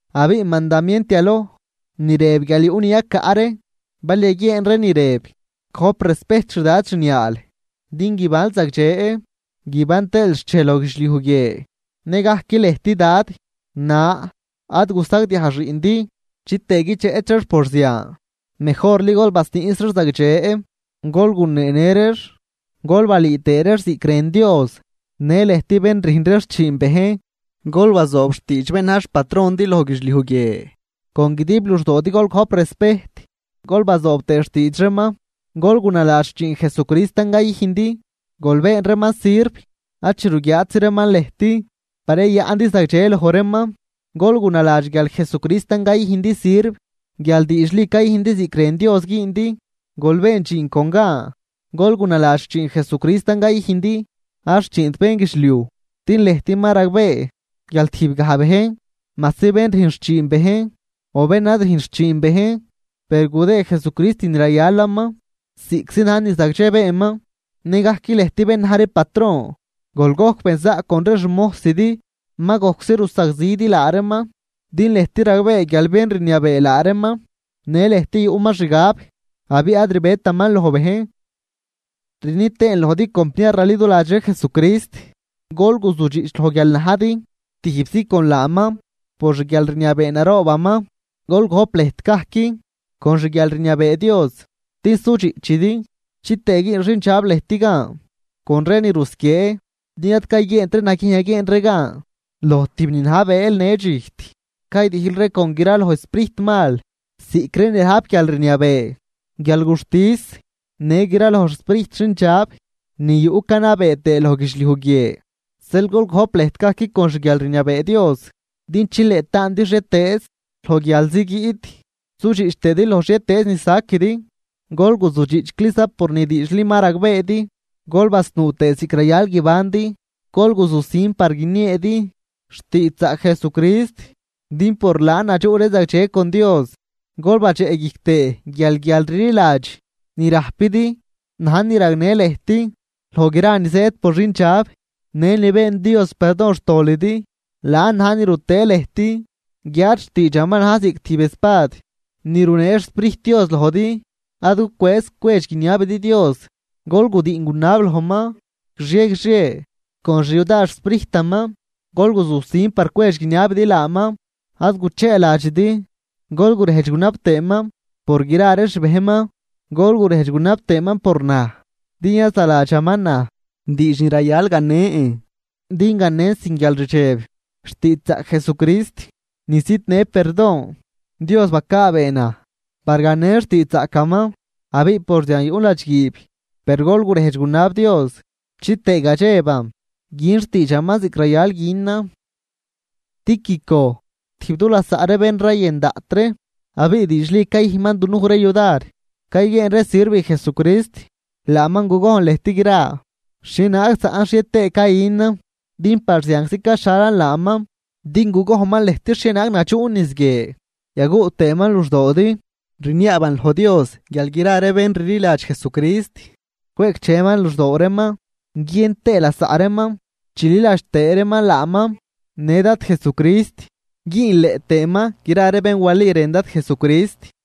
Abiꞌ mandamient yaloj ni rëb guial yuꞌ ni yacaꞌ ree bal yaguieen ree ni rëb: “Gojp respejt xdad xniaal, din guibanl zagdxe guiban tëël xchej loj guidxliuj guie.” Nëgajc lëjt dad na ad gusagdiaj xiꞌndi chitëë guidxeꞌch reex por zian. Mejorli gol basniꞌs reex zagdxe, gol guneenë reex gol balüü tëë reex ziꞌc rën Dios. Në lëjt bén rüjn ree xchiin bejn, gol bazoob xtiidx bén na̱j xpatrondi loj guidxliuj guie. Con guidib luxdoodi gol gojp respejt gol bazoob tëë xtiidx reeman, gol gunaladx xchiin Jesucristan cayüjndi. Gol been reeman sirv ad chi ruguiaatzi reeman lëjt par yayaꞌndi zagdxe loj reeman, gol gunaladx guial Jesucristan cayüjndi sirv guial diidxli cayüjndi ziꞌc rën Dios güündi. Gol been dxiin con gan, gol gunaladx xchiin Jesucrist cayüjndi, ad xchiint bénguidxliuj. Din lëjt ma ragbee guial tijbgaj bejn majsi bén rüjn xchiin bejn o bén ad rüjnt xchiin bejn, per gudëë Jesucrist ni rayalaman ziꞌctzi na̱j ni zagdxe beenman. Nëgajc lëjt bén na̱j ree patron, gol gojc benzaꞌc con ree xmojsidi, ma gojczi rusagzidi laa reeman, din lëjt ragbee guial bén rniabee laa reeman në lëjt yuꞌman xanyabaa, abiꞌ ad rbetaman loj bejn. Rni tëën lojdi compniar raliduladx ree Jesucrist, gol guzudxiꞌch loj guial ma najdi tijbzi con laaman por xguialrniabee naroobaman. Gol gojp lëjt gajc con xguialrniabee Dios din sudxiꞌchidi chitëë güün xindxab lëjt gan con ree ni rusquiee. Din ad cayguieent ree naguiejn yaguieen ree gan loj tijb ni na̱j bëël në dxijt, caydijl ree con gra loj sprijtmal ziꞌc ree ni rajp guialrniabee, guialguxtis në gra loj xsprijt xindxab ni yuꞌ ni canabee tëë loj guidxliuj guie. Zeel gol gojp lëjt gajc con xguialrniabee Dios din chileꞌ taandi xhietëëz loj guialzi guiꞌt sudxiꞌch tëëdi loj xhietëëz ni saquidi. Gol guzudxiꞌchcliza por ni diidxli ni ma ragbeedi, gol basnuu tëë ziꞌc rayal guibandi. Gol guzusin par guinieedi xtiidxzaꞌc Jesucrist din por laan yadxuꞌ ree zagdxe con Dios. Gol badxeꞌguijc tëë guial guialrliladx ni rajpidi na̱j ni ragnë lëjt loj gra ni zëëd por xindxab. Në ni been Dios perdon xtolidi, laan na̱j ni rutëë lëjt, guiáad xtiidxaman na̱j ziꞌc tijb espad ni runee xSprijt Dios lojdi. Ad gucwëëz cwedx guiniabidi Dios. Gol gudiꞌn gunab lojman guixie guixie con xyudar xSprijtaman. Gol guzusin par cwedx guiniabidi laaman, ad gucheeladxidi, gol gurejdx tëëman por gra ree xbejnman. Gol gurejdx gunab tëëman por naj din yazaladxaman naj diidx ni rayal ganen din ganen sin guialrdxeb xtiidxzaꞌc Jesucrist ni zidnë perdon. Dios bacaabee naj par ganen xtiidxzaꞌcaman, abiꞌ por zian yuꞌn ladxguiib. Per gol gurejdx gunab Dios chitëë gadxeban gün xtiidxaman ziꞌc rayal günan. Tíquico, tijb du lasaꞌ ree bén rayën daꞌt ree, abiꞌ diidxli cayüjnman dunuj ree yudar cayguieen ree sirv Jesucrist, laaman gugojn lëjt gra xhienaag zaꞌn xhie tëë cayünan, din par zianczi caxhalan laaman din gugojnman lëjt xhienaag nadxuꞌn niz guie yaguꞌ tëëman luxdoodi. Rniaaban loj Dios guial gra ree bén rliladx Jesucrist, cweꞌcdxeman luxdoo reeman guiën tëë lasaꞌ reeman, chililadx tëë reeman laaman në Dad Jesucrist, güünleꞌ tëëman gra ree bén wali rën Dad Jesucrist.